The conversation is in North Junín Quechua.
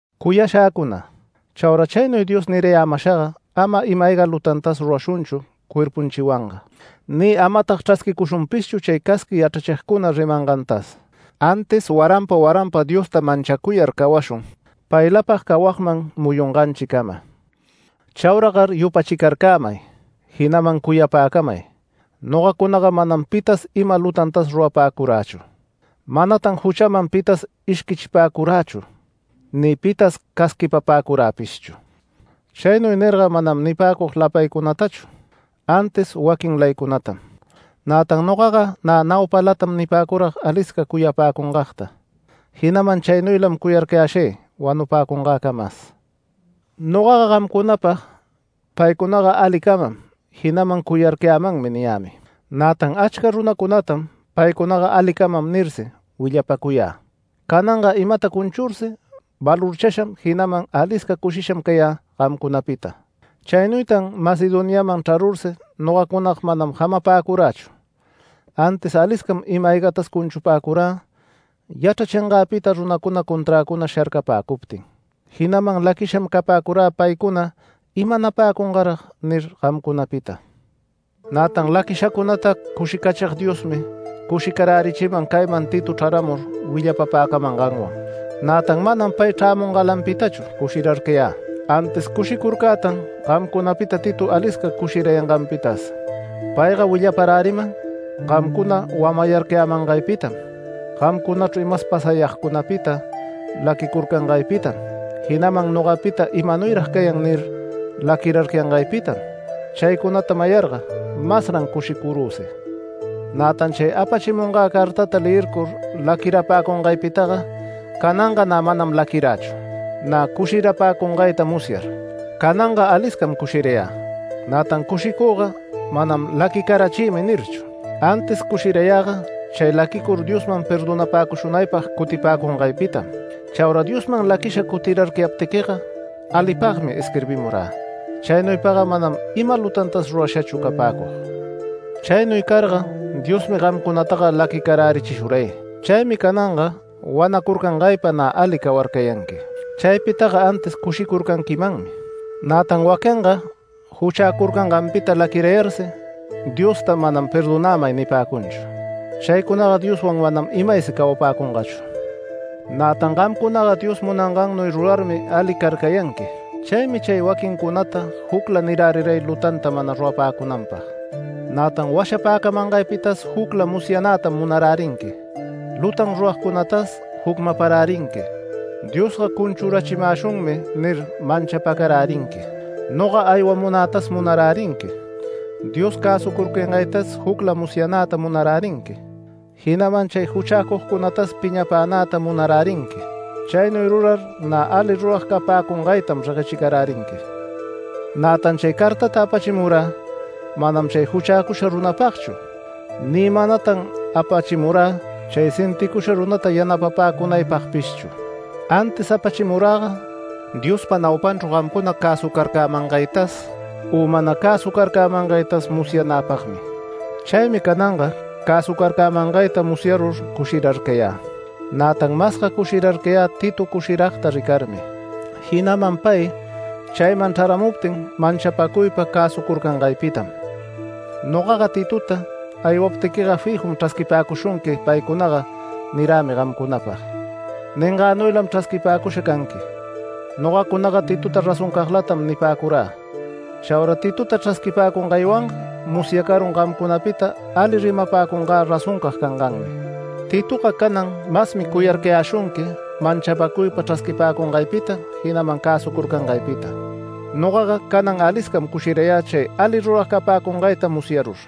Cuyashäcuna, chaura chaynuy Dios nirayämashaga ama ima-ayga lutantas rurashunchu cuerpunchiwanga, ni amatag chrasquicushunpishchu chay casqui yachrachigcuna rimangantas, antis waranpa waranpa Diosta manchacuyar cawashun paylapag cawagman muyunganchicama. Chauragar yupachicarcämay, jinaman cuyapäcamay nogacunaga manam pitas ima lutantas rurapäcurächu. Manatan juchaman pitas ishquichipäcurächu ni pitas casquipapäcuräpishchu. Chaynuy nirga manam nipäcug lapaycunatachu antis waquinlaycunatam. Nätan nogaga nä naupalatam nipäcurag alisca cuyapäcungagta, jinaman chaynuylam cuyarcayäshay wanupäcungäcamas. Nogaga gamcunapag “Paycuna alicamam, jinaman cuyarcayämanmi” niyämi. Nätan achca runacunatam “Paycunaga alicamam” nirsi willapacuyä. Cananga imata cunchursi valorchasham, jinaman alisca cushisham cayä gamcunapita. Chaynuytan Macedoniaman chrarursi nogacunaga mana jamapäcurächu, antis aliscam ima-aygatas cunchupäcurä yachrachingäpita runacuna conträcuna sharcapäcuptin. Jinaman laquisham capäcurä paycuna “¿Imanapäcungarag?” nir gamcunapita. Nätan laquishacunata cushicachig Diosmi cushicarärichiman cayman Tito chraramur willapapäcamanganwan. Nätan manam pay chrämungalanpitachu cushirarcayä, antis cushicurcätan gamcunapita Tito alisca cushirayanganpitas. Payga willaparäriman gamcuna wamayarcayämangaypitam, gamcunachru imas pasayagcunapita laquirarcayangaypitam, jinaman nogapita “¿Imanuyrag cayan?” nir laquirarcayangaypitam. Chaycunata mayarga masran cushicurüsi. Nätan chay apachimungä cartata leyircur laquirapäcungaypitaga, cananga nä manam laquirächu, nä cushirapäcungayta musyar. Cananga aliscam cushirayä. Nätan cushicüga manam “Laquicarachïmi” nirchu, antis cushirayäga chay laquicur Diosman perdonapäcushunaypag cutipäcungaypitam. Chaura Diosman laquisha cutirarcayaptiquiga alipagmi isquirbimurä. Chaynuypaga manam ima lutantas rurashachu capäcug. Chaynuy carga Diosmi gamcunataga laquicarärichishuray. Chaymi cananga wanacurcangaypa nä ali cawarcayanqui. Chaypitaga antis cushicurcanquimanmi. Nätan waquinga juchäcurcanganpita laquirayarsi Diosta manam “Perdonämay” nipäcunchu. Chaycunaga Dioswan manam imaysi cawapäcungachu. Nätan gamcunaga Dios munangannuy rurarmi ali carcayanqui, chaymi chay waquincunata jucla niräriray lutanta mana rurapäcunanpag. Nätan washapäcamangaypitas jucla musyanätam munarärinqui, lutan ruragcunatas jucmaparärinqui, “Diosga cunchurachimäshunmi” nir manchapacarärinqui. Noga aywamunätas munarärinqui, Dios cäsucurcayangaytas jucla musyanäta munarärinqui, jinaman chay juchäcugcunatas piñapänäta munarärinqui. Chaynuy rurar nä ali rurag capäcungaytam reguechicarärinqui. Nätan chay cartata apachimurä manam chay juchäcusha runapagchu ni manatan apachimurä chay sinticusha runata yanapapäcunaypagpishchu, antis apachimuräga Diospa naupanchru gamcuna cäsucarcämangaytas u mana cäsucarcämangaytas musyanäpagmi. Chaymi cananga cäsucarcämangayta musyarur cushirarcayä. Nätan masga cushirarcayä Tito cushiragta ricarmi, jinaman pay chayman chraramuptin manchapacuypa cäsucurcangaypitam. Nogaga Titota “Aywaptiquiga fijum chrasquipäcushunqui paycunaga” nirämi gamcunapag. Ningannuylam chrasquipäcusha canqui, nogacunaga Titota razoncaglatam nipäcurä. Chaura Titota chrasquipäcungaywanga musyacarun gamcunapita alita rimapäcungä razoncag canganmi. Titoga canan masmi cuyarcayäshunqui manchapacuypa chrasquipäcungaypita, jinaman cäsucurcangaypita. Nogaga canan aliscam cushirayä chay ali rurag capäcungayta musyarur.